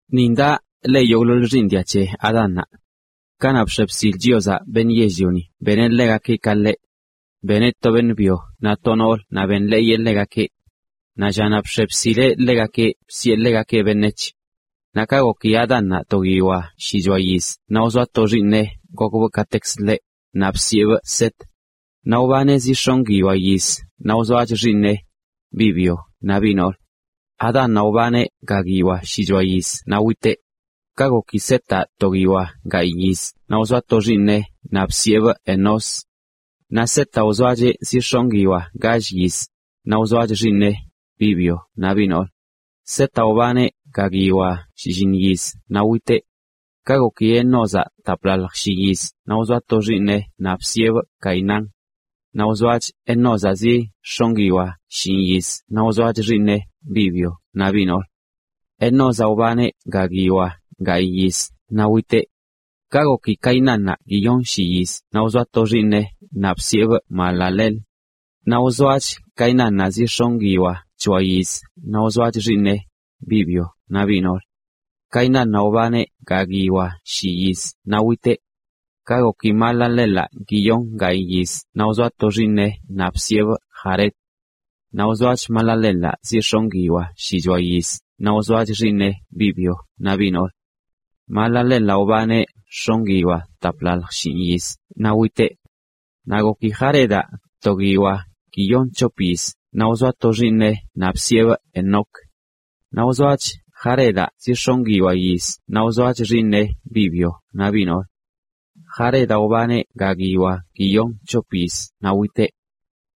Nin daꞌ le yogꞌḻoḻ xiiṉ dia c̱he Adánnaꞌ. Kanaꞌ bx̱e bsil Chiozaꞌ beṉꞌ yell-lioni beneꞌ ḻegakeꞌ ka ḻeꞌ. Beneꞌ to beṉꞌ byo naꞌ to noolə naꞌ benḻeeyeꞌ ḻegakeꞌ. Naꞌ llanaꞌ bx̱e bsileꞌ ḻegakeꞌ bsiꞌe ḻegakeꞌ “beṉec̱h”. Naꞌ ka goki Adánnaꞌ to guiyoa shichoa yiz naꞌ wzoa to xiiṉeꞌ gokbꞌ katekzə ḻeꞌ, naꞌ bsiꞌebꞌ Set. Naꞌ wbaneꞌ zi x̱onꞌ guiyoa yiz naꞌ wzoach xiiṉeꞌ, biꞌ byo naꞌ biꞌ noolə. Adánnaꞌ wbaneꞌ ga guiyoa shichoa yiz naꞌ witeꞌ. Ka goki Setaꞌ to guiyoa gayꞌ yiz naꞌ wzoaꞌ to xiiṉeꞌ naꞌ bsiꞌebꞌ Enós. Naꞌ Setaꞌ wzoacheꞌ zi x̱onꞌ guiyoa gall yiz, naꞌ wzoach xiiṉeꞌ, biꞌ byo naꞌ biꞌ noolə. Setaꞌ wbaneꞌ ga guiyoa shlliṉ yiz naꞌ witeꞌ. Ka goki Enózaꞌ taplalj shi yiz naꞌ wzoaꞌ to xiiṉeꞌ naꞌ bsiꞌebꞌ Cainán. Naꞌ wzoach Enózaꞌ zi x̱onꞌ guiyoa shinꞌ yiz naꞌ wzoach xiiṉeꞌ, biꞌ byo naꞌ biꞌ noolə. Enózaꞌ wbaneꞌ ga guiyoa gayꞌ yiz naꞌ witeꞌ. Ka goki Cainánnaꞌ guiyonshi yiz naꞌ wzoa to xiiṉeꞌ naꞌ bsiꞌebꞌ Mahalaleel. Naꞌ wzoach Cainánnaꞌ zi x̱onꞌ guiyoa c̱hoa yiz naꞌ wzoach xiiṉeꞌ, biꞌ byo naꞌ biꞌ noolə. Cainánnaꞌ wbaneꞌ ga guiyoa shi yiz naꞌ witeꞌ. Ka goki Mahalaleelaꞌ guiyon gayꞌ yiz naꞌ wzoa to xiiṉeꞌ naꞌ bsiꞌebꞌ Jared. Naꞌ wzoach Mahalaleelaꞌ zi x̱onꞌ guiyoa shichoa yiz naꞌ wzoach xiiṉeꞌ, biꞌ byo naꞌ biꞌ noolə. Mahalaleelaꞌ wbaneꞌ x̱onꞌ guiyoa taplalj shinꞌ yiz naꞌ witeꞌ. Naꞌ goki Jaredaꞌ to guiyoa guiyon c̱hop yiz naꞌ wzoa to xiiṉeꞌ naꞌ bsiꞌebꞌ Enoc. Naꞌ wzoach Jaredaꞌ zi x̱onꞌ guiyoa yiz naꞌ wzoach xiiṉeꞌ, biꞌ byo naꞌ biꞌ noolə. Jaredaꞌ wbaneꞌ ga guiyoa guiyon c̱hop yiz naꞌ witeꞌ.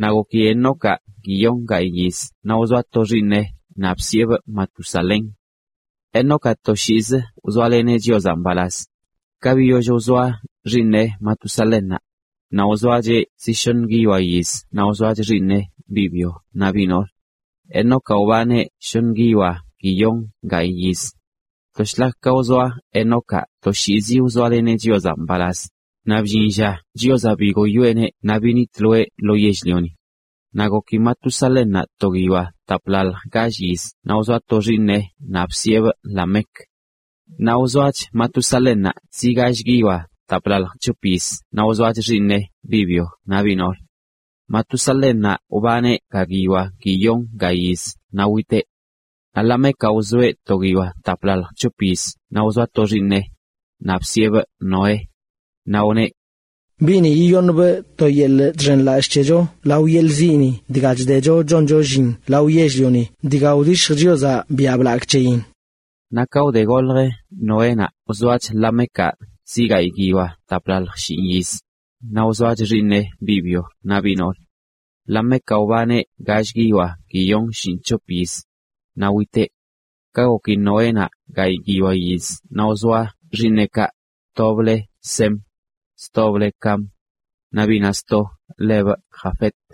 Naꞌ goki Enocaꞌ guiyon gayꞌ yiz naꞌ wzoaꞌ to xiiṉeꞌ naꞌ bsiꞌebꞌ Matusalén. Enocaꞌ toshiizi wzoaleneꞌ Chiozaꞌ mbalaz. Ka biyoll wzoa xiiṉeꞌ Matusalénnaꞌ, naꞌ wzoacheꞌ zi shoṉ guiyoa yiz naꞌ wzoach xiiṉeꞌ, biꞌ byo naꞌ biꞌ noolə. Enocaꞌ wbaneꞌ shoṉ guiyoa guiyon gayꞌ yiz. To shlak ka wzoa Enocaꞌ toshiizi wzoaleneꞌ Chiozaꞌ mbalaz, naꞌ bllin lla Chiozaꞌ bigoyoeꞌneꞌ naꞌ binitloeꞌ lo yell-lioni. Naꞌ goki Matusalénnaꞌ to guiyoa taplalj gall yiz naꞌ wzoa to xiiṉeꞌ naꞌ bsiꞌebꞌ Lamec. Naꞌ wzoach Matusalénnaꞌ zi gall guiyoa taplalj c̱hop yiz naꞌ wzoach xiiṉeꞌ, biꞌ byo naꞌ biꞌ noolə. Matusalénnaꞌ wbaneꞌ ga guiyoa guiyon ga yiz naꞌ witeꞌ. Naꞌ Lamecaꞌ wzoeꞌ to guiyoa taplalj c̱hop yiz naꞌ wzoa to xiiṉe, naꞌ bsiꞌebꞌ Noé. Naꞌ wneꞌ: “Biꞌni yiyoṉbꞌ to yeḻꞌ chxenlallꞌ c̱hecho lao yeḻꞌ ziꞌni dga chdecho choncho llin lao yell-lioni dga wdishj Chiozaꞌ biaꞌ blagꞌ c̱heyin.” Naꞌ ka wde golj Noénaꞌ wzoach Lamecaꞌ zi gayꞌ guiyoa taplalj shinꞌ yiz, naꞌ wzoach xiiṉeꞌ, biꞌ byo naꞌ biꞌ noolə. Lamecaꞌ wbaneꞌ gall guiyoa guiyon shinꞌc̱hop yiz, naꞌ witeꞌ. Ka goki Noénaꞌ gayꞌ guiyoa yiz naꞌ wzoa xiiṉeꞌkaꞌ, tobꞌ le Sem, stobꞌ le Cam, naꞌ biꞌnaꞌ sto lebꞌ Jafet.